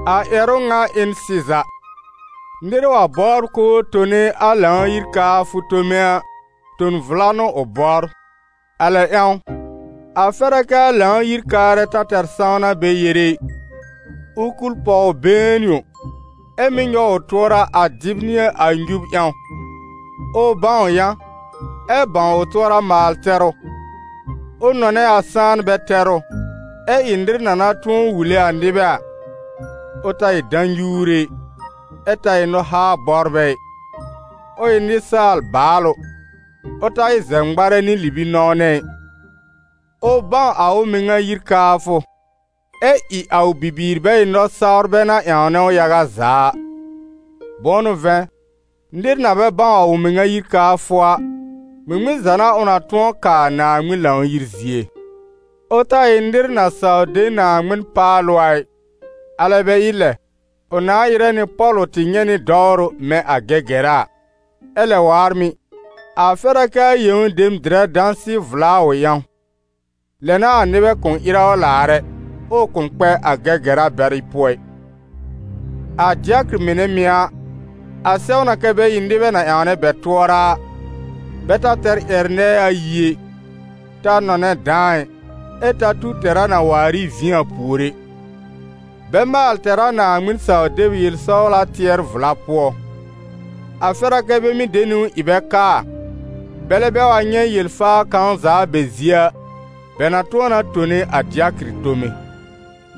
A ƴɛrʋ ŋa ɩ n sɩza: nɩr wa bɔbr k'ʋʋ tone a Lãw-yir kaafʋ tome a, ton vla n'ʋ ʋ bɔbr. A lɛ ƴãw, a fɛr a kɛ a Lãw-yir-kaarɛ ta tɛr sãwna bɛ yere ɩ, ʋ kul pɔw been yõ, ɛ́ mɩ́ nyɔw ʋ tʋɔra a dɩb nɩ a nyub ƴãw, ʋ bãw yã, ɛ bãw ʋ tʋɔra maal-tɛrʋ, ʋ nɔnɛ a sãanbɛ tɛrʋ, ɛ́ ɩ nɩr na na tʋ̃ɔ wule a nɩbɛ a; ʋ ta ɩ dã-nyuure ɩ, ɛ ta ɩ nɔ-haa-bɔbrɛ ɩ. Ʋ ɩ nɩsaal baalʋ, ʋ ta ɩ zɛb-ŋmarɛ nɩ libi-nɔ̃wnɛ ɩ. Ʋ bãw a ʋ mɩŋa yir kaafʋ, ɛ ɩ a ʋ bibiir bɛ ɩ nɔ-sawrbɛ na ƴãwnɛ ʋ yaga za a. Bʋ̃ʋ n'ʋ vɛ̃, nɩr na bɛ bãw a ʋ mɩŋa yir kaafʋ a, ŋmɩŋmɩn za n'a ʋ na tʋ̃ɔ kaa Naaŋmɩn Lãw-yir zie? Ʋ ta ɩ nɩr na saw de Naaŋmɩn paalʋ a ɩ, alɛ bɛ ɩ lɛ, ʋ nãa ɩrɛ nɩ pɔ̀lʋ tɩ nyɛ̃ nɩ dɔwrʋ mɛ̃ a Gɛgɛra a. Ɛ lɛ waar mɩ̀, a fɛr a kɛ a yẽw dem dɩrɛ dãsɩ-vla a ʋ ƴãw, lɛ n'a a nɩbɛ kʋ̃ ɩrɛ ʋ laar ɛ, ɛ ʋ kʋ̃ kpɛ a Gɛgɛra bɛrɩ pʋɔ ɩ. A dɩakɩr mɩnɛ mɩ̀ a, a sɛw na kɛ́ bɛ ɩ nɩbɛ na ƴãwnɛ bɛ tʋɔra a, bɛ ta tɛr ƴɛr- nɛɛ ayi ɛ, ta nɔnɛ dãa ɩ, ɛ ta tu tɛra na waar ɩ vĩ a pùor ɛ; Bɛ maal tɛr a Naaŋmɩn-saw-deb yel-sɔwla tɩɛr-vla pʋɔ. A fɛr a kɛ́ bɛ mɩ́ de niwn ɩ bɛ kaa, bɛlɛ bɛ wa nyɛ̃ yel-faa kãw za a bɛ zie a, bɛ na tʋ̃ɔ na tone a dɩakɩr tome.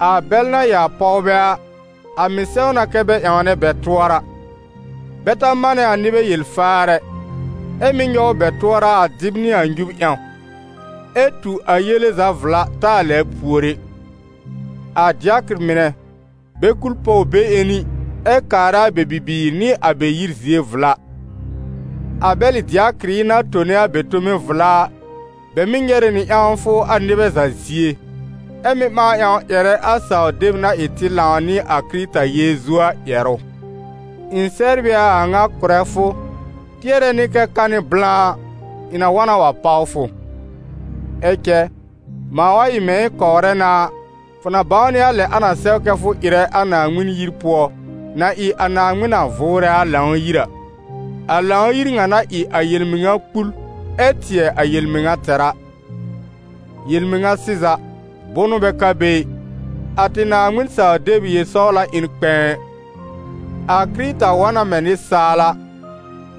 A bɛl na ɩ a pɔwbɛ a, a mɩ̀ sɛw na kɛ bɛ ƴãwnɛ bɛ tʋɔra; bɛ ta manɛ a nɩbɛ yel-faar ɛ, ɛ mɩ́ nyɔw bɛ tʋɔra a dɩb nɩ a nyub ƴãw, ɛ tu a yele za vla taa lɛbr pùor ɛ. A dɩakɩr mɩnɛ, bɛ kul pɔw be-ƴẽni ɛ kaarɛ a bɛ bibiir nɩ a bɛ yir zie vla. A bɛlɩ dɩakɩrɩ na tone a bɛ tome vla a, bɛ mɩ́ nyɛrɛ nɩ ƴãwfʋ a nɩbɛ za zie, ɛ mɩ́ ɓãa ƴãw ƴɛrɛ a saw-deb na ɩ tɩ lãw nɩ a Kɩrɩta Yeezu a ƴɛrʋ. Ɩ̃ sɛbr ɩ a a ŋa kʋ̀rɛ fʋ, tɩɛrɛ nɩ kɛ ka nɩ blã a, ɩ̃ na wa na wa páw fʋ. Ɛ cɛ, mãa wa ɩ mɛ̃ ɩ̃ kɔwrɛ na a, fʋ na bãwnɩ a lɛ a na sɛw kɛ fʋ ɩrɛ a Naaŋmɩn yir pʋɔ na ɩ a Naaŋmɩn na vʋʋrɛ a Lãw-yir a, a Lãw-yir ŋa na ɩ a yel-mɩŋa kpul ɛ tɩɛ a yel-mɩŋa tɛr a. Yel-mɩŋa sɩza, bʋnʋ bɛ ka be ɩ, a tɩ Naaŋmɩn-saw-deb yel-sɔwla ɩ n kpɛ̃ɛ. A Kɩrɩta wa na mɛ̃ nɩsaal a,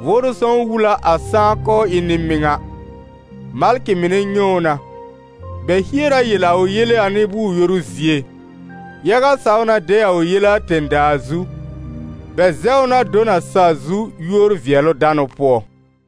Vʋʋrʋ Sõw wul a a sãá k'ʋʋ ɩ n nɩ-mɩŋa, malkɩ mɩnɛ nyɛ̃ ʋ na, bɛ hier a yel a ʋ yele a nɩ-bʋʋr-yoru zie, yaga saw na de a ʋ yele a tẽ-daa zu, bɛ zɛw ʋ na do n a sa-zu yúor-vɩɛlʋ-danʋ pʋɔ.